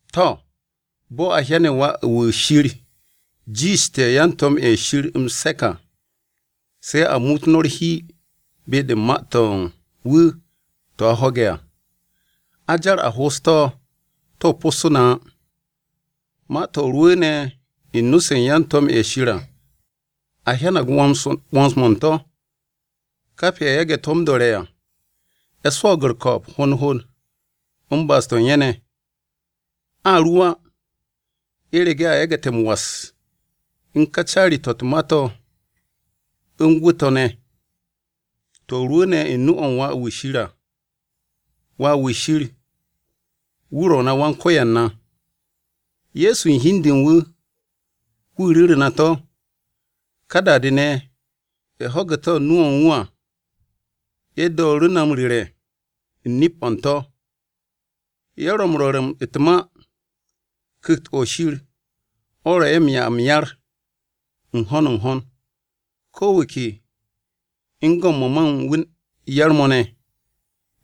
To̱, bo̱ a hyane̱ Wà-wu̱ Shir jiishte̱ yan-to̱m-ye̱ Shir m-se̱k à, se̱ a muut no̱ u̱r-hi be-de u̱n ma-to̱ u̱n wu̱ to̱ a ho̱ge̱ à. A jar a ho'os to̱, to̱ possu̱ na á. Ma-to̱ rwu̱u̱ne̱ u̱n nu-se u̱n yan-to̱m-ye̱ Shir à, a hyanag 'wo̱ns-mo̱ u̱n to̱. Kap ye̱ yage̱ to̱ m-do̱re̱ à, ye̱ swo̱o̱g u̱r-ko̱o̱b hond hond u̱n ba'as-to̱ u̱n ye̱ ne̱. A ru á, u̱rege̱ a yagu̱te̱ m-was u̱n ka caari-to̱ u̱t-ma to̱ u̱n gwu̱ to̱ ne̱. To̱ rwu̱u̱ne̱ u̱n nu-o̱ u̱n Wà-wu̱ Shir à. Wà-wu̱ Shir, wu̱ ro̱ na Wan-Ko̱yan à, Ye̱so u̱n hi u̱n de u̱n wu̱, wu̱ ru̱ru̱ na to̱. Ká da-de ne̱, ye̱ ho̱ge̱ to̱ u̱n nu-o̱ u̱n wu̱ à, ye̱ dooru̱ na m-ru̱re̱ u̱n nip-o̱ u̱n to̱. Ye̱ ro̱ m-rwo̱r u̱t-ma, Ku̱kt-o̱ Shir o̱ ro̱ ye̱ m-'ya m-yar u̱n ho̱n n-ho̱n, ko̱ wu̱ ke u̱n go̱ u̱n mo̱ ma u̱n wu̱ yar-mo̱ ne̱,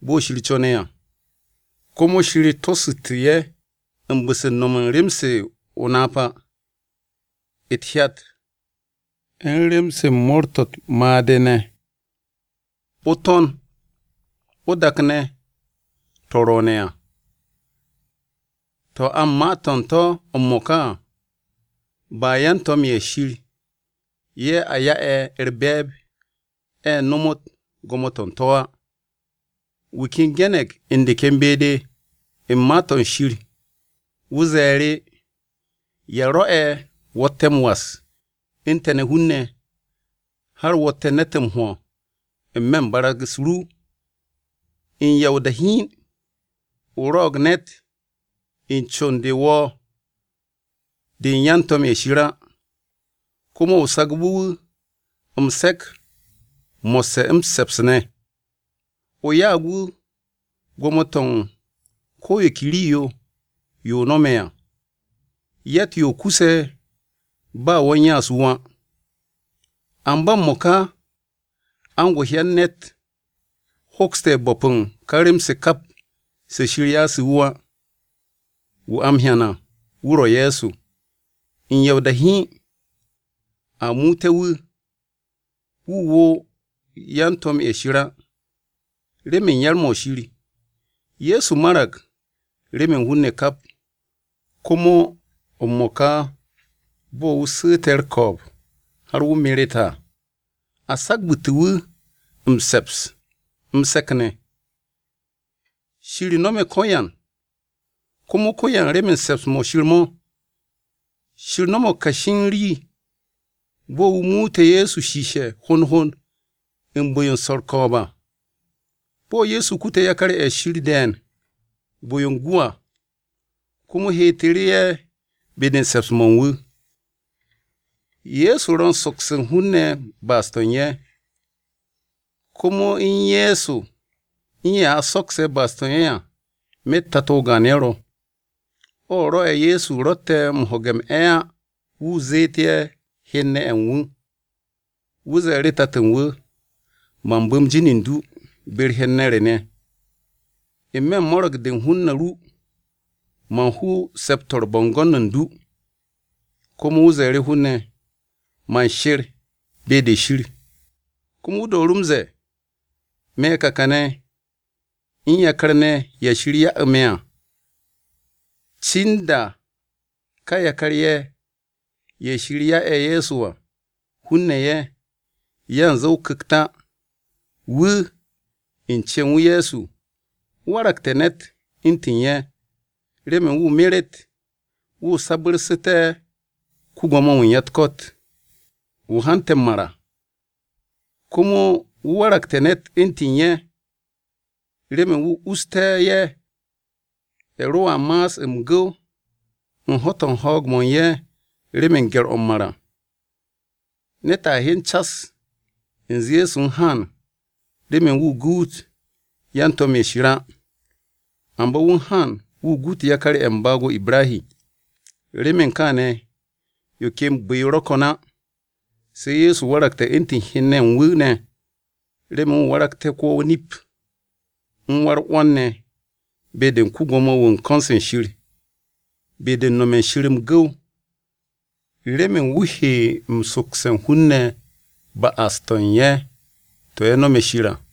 bo̱ Shir co̱ne̱ à. Komo Shir tosu̱tu̱ ye̱ u̱n bu̱-se u̱n no̱m u̱n rem-se o-napa, u̱t-hyat, u̱n rem-se mo̱o̱r-to̱ u̱t-made̱ ne̱. O-To̱n, o-dak ne̱ to̱ ro̱o̱ne̱ à, to̱ a u̱n ma-to̱ u̱n to̱ m-mo̱ka à, ba yan-to̱m-ye̱ Shir ye̱ a ya'e̱ u̱r-be̱e̱b ye̱ nomot gwo̱mo-to̱ u̱n to̱ á. Wu̱ ken ge̱ne̱g u̱n de ken be-de u̱n Ma-to̱ Shir, wu̱ ze̱e̱ru̱; “¿Ya rwo̱'e̱ wo̱tte̱ m-was u̱n te̱ ne̱ hun-ne̱, har wo̱tte̱ ne̱t m-hwo̱ n-me̱ u̱n barag-u̱s ru? U̱n ya o-da hiin, o rwo̱'o̱g ne̱t u̱n con-de wo̱ de u̱n yan-to̱m-ye̱ Shir á. Komo o sagbu̱ wu̱ m-se̱k mo̱sse̱ m-se̱ps ne̱. O ya'ag wu̱ gwo̱mo-to̱ u̱n ko̱ yo ke rii-yo, yo o no̱me̱ à.” Yatt-yo kuse̱ ba wo̱ u̱n ya'as wu̱ á. Amba m-mo̱ka a u̱n go hyan ne̱t hokste̱ bo̱p u̱n ka rem-se kap se Shir ya'ase̱ wu̱ á. Wu̱ a m-hyan à wu̱ ro̱ Ye̱so, u̱n ya o-da hiin a muute̱ wu̱, wu̱ wo̱o̱ yan-to̱m-ye̱ Shir á. Remen yar-mo̱ Shir, Ye̱so marag remen hun-ne̱ kap. Komo m-mo̱ka bo̱ wu̱ su̱u̱te̱ u̱r-ko̱o̱b har wu̱ meret à, a sagabu̱tu̱ wu̱ m-se̱ps, m-se̱k ne̱. Shir no̱me̱ ko̱yan, komo ko̱yan remen se̱ps-mo̱ Shir mo̱. Shir no̱mo̱g kashi u̱n rii bo̱ wu̱ muute̱ Ye̱so shiishe̱ hond hond u̱n bu̱-yo u̱n swo̱ u̱r-ko̱o̱b à, bo̱ Ye̱so kute̱ yakar-ye̱ Shir de̱e̱n bu̱-yo u̱n gwu̱ à, komo heetu̱ru̱ ye̱ be-de u̱n se̱ps-mo̱ u̱n wu̱. Ye̱so ro̱ u̱n sokse̱ u̱n hun-ne̱ ba'as-to̱ u̱n ye̱. Komo u̱n Ye̱so u̱n ye̱ a sokse̱ ba'as-to̱ u̱n ye̱ à, myet Tato o-gaan ye̱ ro̱. O rwo̱'e̱ Ye̱so ro̱tte̱ m-ho̱ge̱ m-'e̱ á, wu̱ zeet ye̱ hen-ne̱ ye̱ u̱n wu̱. Wu̱ ze̱e̱ru̱ Tato u̱n wu̱, “Man bu̱m jin u̱n du be-u̱r hen-ne̱ re ne̱. N-me̱ u̱n mo̱ro̱g-de u̱n hun-ne̱ ru, man hu se̱p-to̱ u̱n bo̱ngo̱n u̱n du.” Komo wu̱ ze̱e̱ru̱ hun-ne̱, “Man she̱r be-de Shir.” Komo wu̱ dooru̱ m-ze̱e̱, “Me̱ ka kane̱ u̱n yakar-ne̱ ye̱ Shir ya'u̱ me̱ à.” Cin da ka yakar-ye̱ ye̱ Shir ya'e̱ Ye̱so à, hun-ne̱ ye̱, yanze o-Ku̱kt á, wu̱, u̱n cen wu̱ Ye̱so, wu̱ waragte̱ ne̱t u̱ntu̱n ye̱, remen wu̱ meret, wu̱ sabu̱rsu̱te̱ ko-Gwo̱mo-wu̱ u̱n ya-u̱t-ko̱t, wu̱ hante̱ m-mar à. Komo wu̱ waragte̱ ne̱t u̱ntu̱n ye̱, remen wu̱ usté̱ ye̱, ye̱ roa ma'as m-gu̱w u̱n ho̱-to̱ u̱n ho̱o̱g-mo̱ u̱n ye̱ remen gye̱r-o̱ m-mar à. Ne̱t a hyen cas u̱nze Ye̱so u̱n haan remen wu̱ guut yan-to̱m-ye̱ Shir á, amba wu̱ u̱n haan wu̱ guut yakar-ye̱ u̱n baag-o Ibrahi. Remen kaane̱ yo ken bu̱-yo ro̱ ko̱n á, se̱ Ye̱so waragte̱ u̱ntu̱n hen-ne̱ ye̱ u̱n wu̱ ne̱, remen wu̱ waragté̱ ko-wa-o-nip, u̱n wa-u̱r-'wo̱n ne̱ be-de ko-Gwo̱mo-wu̱ u̱n ko̱n-se Shir, be-de u̱n no̱me̱ Shir m-gu̱w, remen wu̱ he sokse̱ u̱n hun-ne̱ ba'as-to̱ u̱n ye̱ to̱ ye̱ nome̱ Shir à.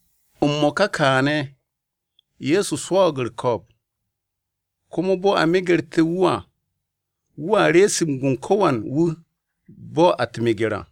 M-mo̱ka kaane̱, Ye̱so swo̱o̱g u̱r-ko̱o̱b komo bo̱ a megerte̱ wu̱ à, wu̱a rees gun ko̱wan wu̱ a u̱t-meger à.